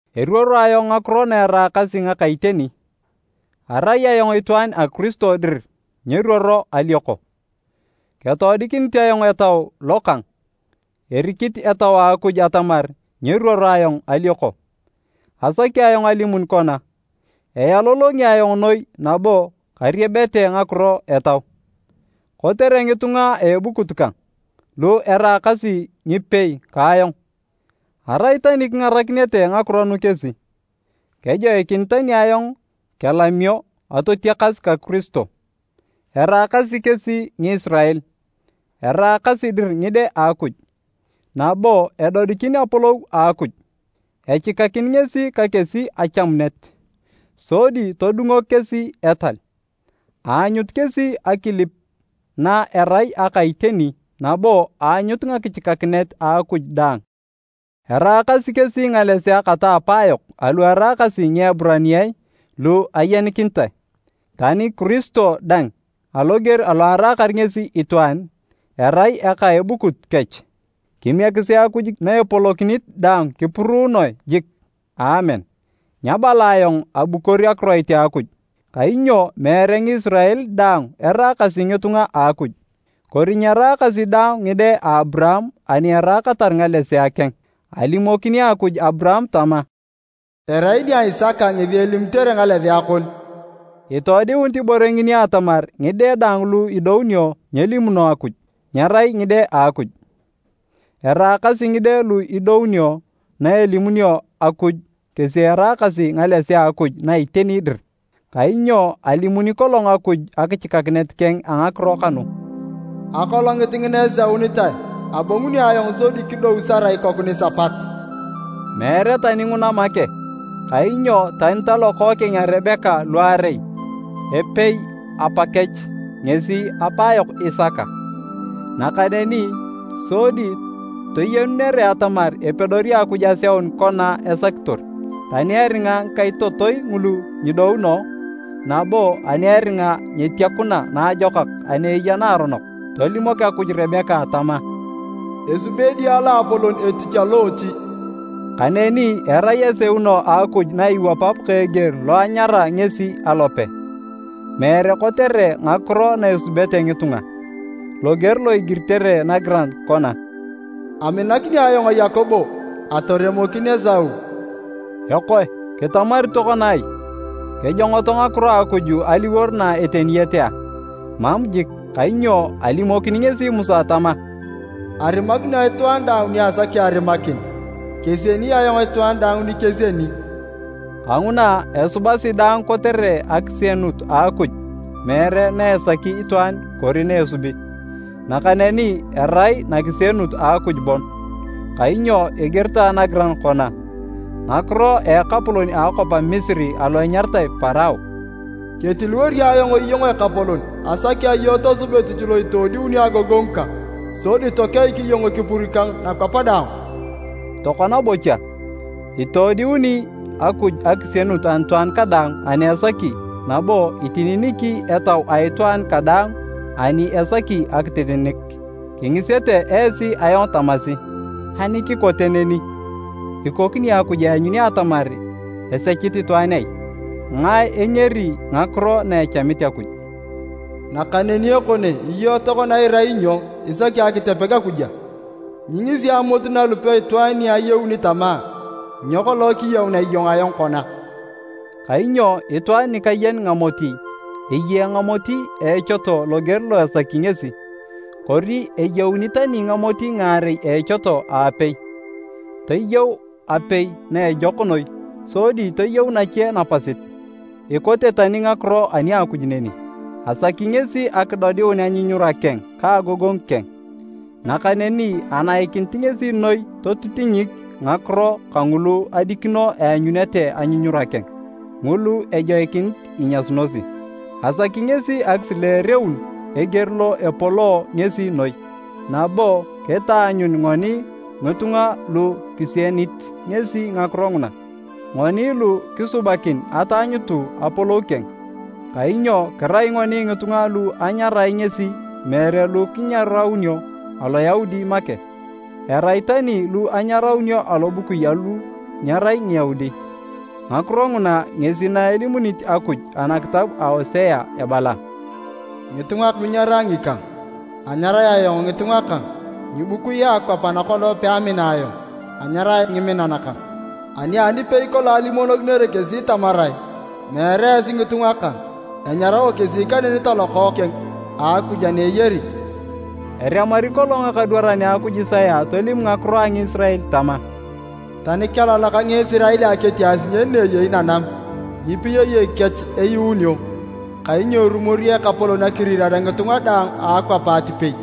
Eruoro ayong ngakiro na eraakasi ngaka iteni, arai ayong itwaan a Kiristo dir nyeruoro alioko. Ketoodikinit ayong Etau lo kang, erikit Etau a Akuj atamar nyeruoro ayong alioko. Asaki ayong alimun kona, ealolongi ayong noi nabo kariebete ngakiro etau kotere ngitunga a ebukut kang, lu eraakasi ngipei ka ayong! Arai tani kingarakinete ngakiro nu kesi, kejoikinit tani ayong kelamio atotiakas ka Kiristo. Eraakasi kesi Ngisirael, eraakasi dir ngide a Akuj, nabo edodikin apolou a Akuj. Echikakin ngesi ka kesi achamunet, sodi todungok kesi etal, aanyut kesi akilip na erai aka iteni nabo aanyut ngakichikakinet a Akuj dang, eraakasi kesi ngalesea kata apaayok alu eraakasi Ngieburaniae lu ayenikinitae. Tani Kiristo dang aloger alo araakar ngesi itwaan, arai eka a ebukut kech. Kimiekisi Akuj na epolokinit daang kipuruunoe jik! Aamen. Nyabala ayong abukor akiroit a Akuj, kainyo meere Ngisirael daang eraakasi ngitunga a Akuj. Kori nyeraakasi daang ngide a Aburaam ani eraakatar ngalesea keng. Alimokini Akuj Aburaam tama, “Erai nia Isaka ngesi elimitere ngalesea kon.” Itoodiunit ibore ngini atamar ngide daang lu idounio nyelimuno Akuj, nyerai ngide a Akuj. Eraakasi ngide lu idounio na elimunio Akuj kesi eraakasi ngalesea a Akuj na iteni dir. Kainyo alimuni kolong Akuj akichikakinet keng a ngakiro kanu, “Akolongit ngina eseunitae, abonguni ayong, sodi kidou Sara ikoku nisapat.” Meere tani nguna make, kainyo tani talokookeng a Rebeka luarei, epei apakech, ngesi apaayok Isaka. Nakaneni sodi toyenunere atamar epedori Akuj aseun kona esakitor, tani eringa ngikaitotoi ngulu nyidouno, nabo ani eringa nyetiakuna naajokak ani eya naaronok, tolimok Akuj Rebeka tama, “Esubi edia loapolon etich aloochi.” Kaneni erai aseuno a Akuj na iwapap ka eger lo anyara ngesi alope, meere kotere ngakiro na esubete ngitunga. Loger lo igiritere nagiran kona, “Aminakini ayong Yakobo, atoremokin Esau.” Ekoe kitamari tokona ai? Kejongoto ngakiro a Akuj aliwor na eteniyete a? Mam jik! Kainyo alimokini ngesi Musa tama, “Arimakini ayong itwaan daang ni asaki arimakin, kesieni ayong itwaan daang ni kesieni.” Kanguna, esubasi daang kotere akisienut a Akuj meere na esaki itwaan kori na esubi, nakaneni erai nakisienut a Akuj bon. Kainyo igiritae nagiran kona ngakiro a ekapolon a akwap a Misiri alo enyaritae Parao, “Ketiliwori ayong iyong ekapolon asaki iyong tosub etich lo itoodiuni agogongu kang. Sodi tokeik iyong ekipur kang nakwap daang.” Tokona bocha, itoodiuni Akuj akisienut anitwaan kadaang ani esaki nabo itininiki etau a itwaan kadaang ani esaki akitininik. Kingisete esi ayong tamasi, “Ani kikote neni, ikokini Akuj eanyuni atamar esechit itwaan ai? Ngae engeri ngakiro na echamit Akuj?” Nakaneni ekone iyong tokona irai nyo isaki akitepeg Akuj? Nyingisi amot nalupe itwaan ni ayeuni tama, “Nyo kolong kiyeunea iyong ayong kona?” Kainyo itwaan nikayen ngamoti, eyee ngamoti a echoto loger lo esaki ngesi. Kori eyeuni tani ngamoti ngaarei a echoto a epei, toyeu apei na ejok noi sodi toyeu nache napasit. Ikote tani ngakiro ani a Akuj neni. Asaki ngesi akidodiun anyunyura keng ka agogongu keng. Nakaneni anaikinit ngesi noi totitinyik ngakiro kangulu adikino eanyunete anyunyura keng, ngulu ejoikinit inyasunosi. Asaki ngesi akisileereun eger lo epoloo ngesi noi, nabo kitaanyun ngoni ngitunga lu kisienit ngesi ngakiro nguna. Ngoni lu kisubakin ataanyutu apolou keng. Kainyo kirai ngoni ngitunga lu anyarae ngesi meere lu kinyaraunio Aloyaudi make, erai tani lu anyaraunio alobukui alu nyerai Ngiyaudi. Ngakiro nguna ngesi na elimunit Akuj anakitab a Osea ebala, “Ngitunga lu nyerai ngikang, anyarae ayong, ‘Ngitunga kang.’ Ngibukui a akwap ana kolong peamina ayong anyarae ‘Ngiminan kang.’ Ani nipei kolong alimonokinere kesi tamarae, ‘Meere esi ngitunga kang,’ enyarao kesi kaneni talokookeng a Akuj ana eyari.” Eremari kolong ekadwaran a Akuj Isaya tolim ngakiro a Ngisirael tama, “Tani kelalak Ngisirael ketia asinyen na eyei nanam, ngipiyayek kech eyuunio, kainyo erumori Ekapolon akirirare ngitunga daang a akwap atipei.”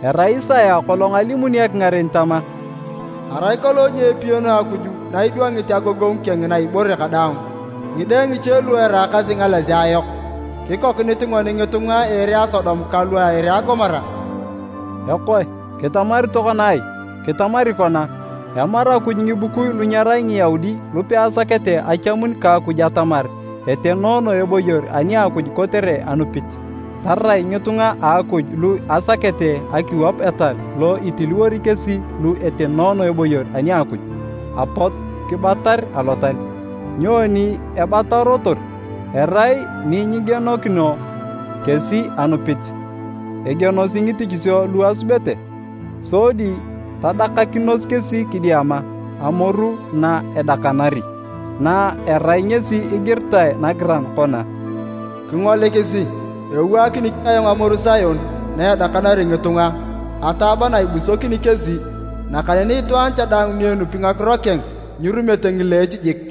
Erai Isaya kolong alimuni ekingaren tama, “Arai kolong nyeepiyanu Akuj na idwangit agogongu keng na ibore kadaang ngide ngiche lu eraakasi ngalesea yok, kikokinit ngoni ngitunga a ere a Sodom kalu a ere a Gomora.” Ekoe kitamari tokona ai? Kitamari kona, emaru Akuj ngibukui lu nyerai Ngiyaudi lu peasakete achamun ka Akuj atamar etenoono eboyor ani a Akuj kotere anupit, tarai ngitunga a Akuj lu asakete akiwap etal lo itiliwori kesi lu etenoono eboyor ani a Akuj, apot kibatar alotal. Nyoni ebatarotor? Erai ni nyigienokino kesi anupit, egienosi ngitichisio lu asubete. Sodi tadakakinos kesi kidiama “amoru na edakanari” na erai ngesi igiritae nagiran kona, “Kingolikisi, ewaakini ayong amoru Sion na edakanari ngitunga, ataaba na ibusokini kesi. Nakaneni itwaan cha daang ni enupi ngakiro keng nyirumete ngileech jik.”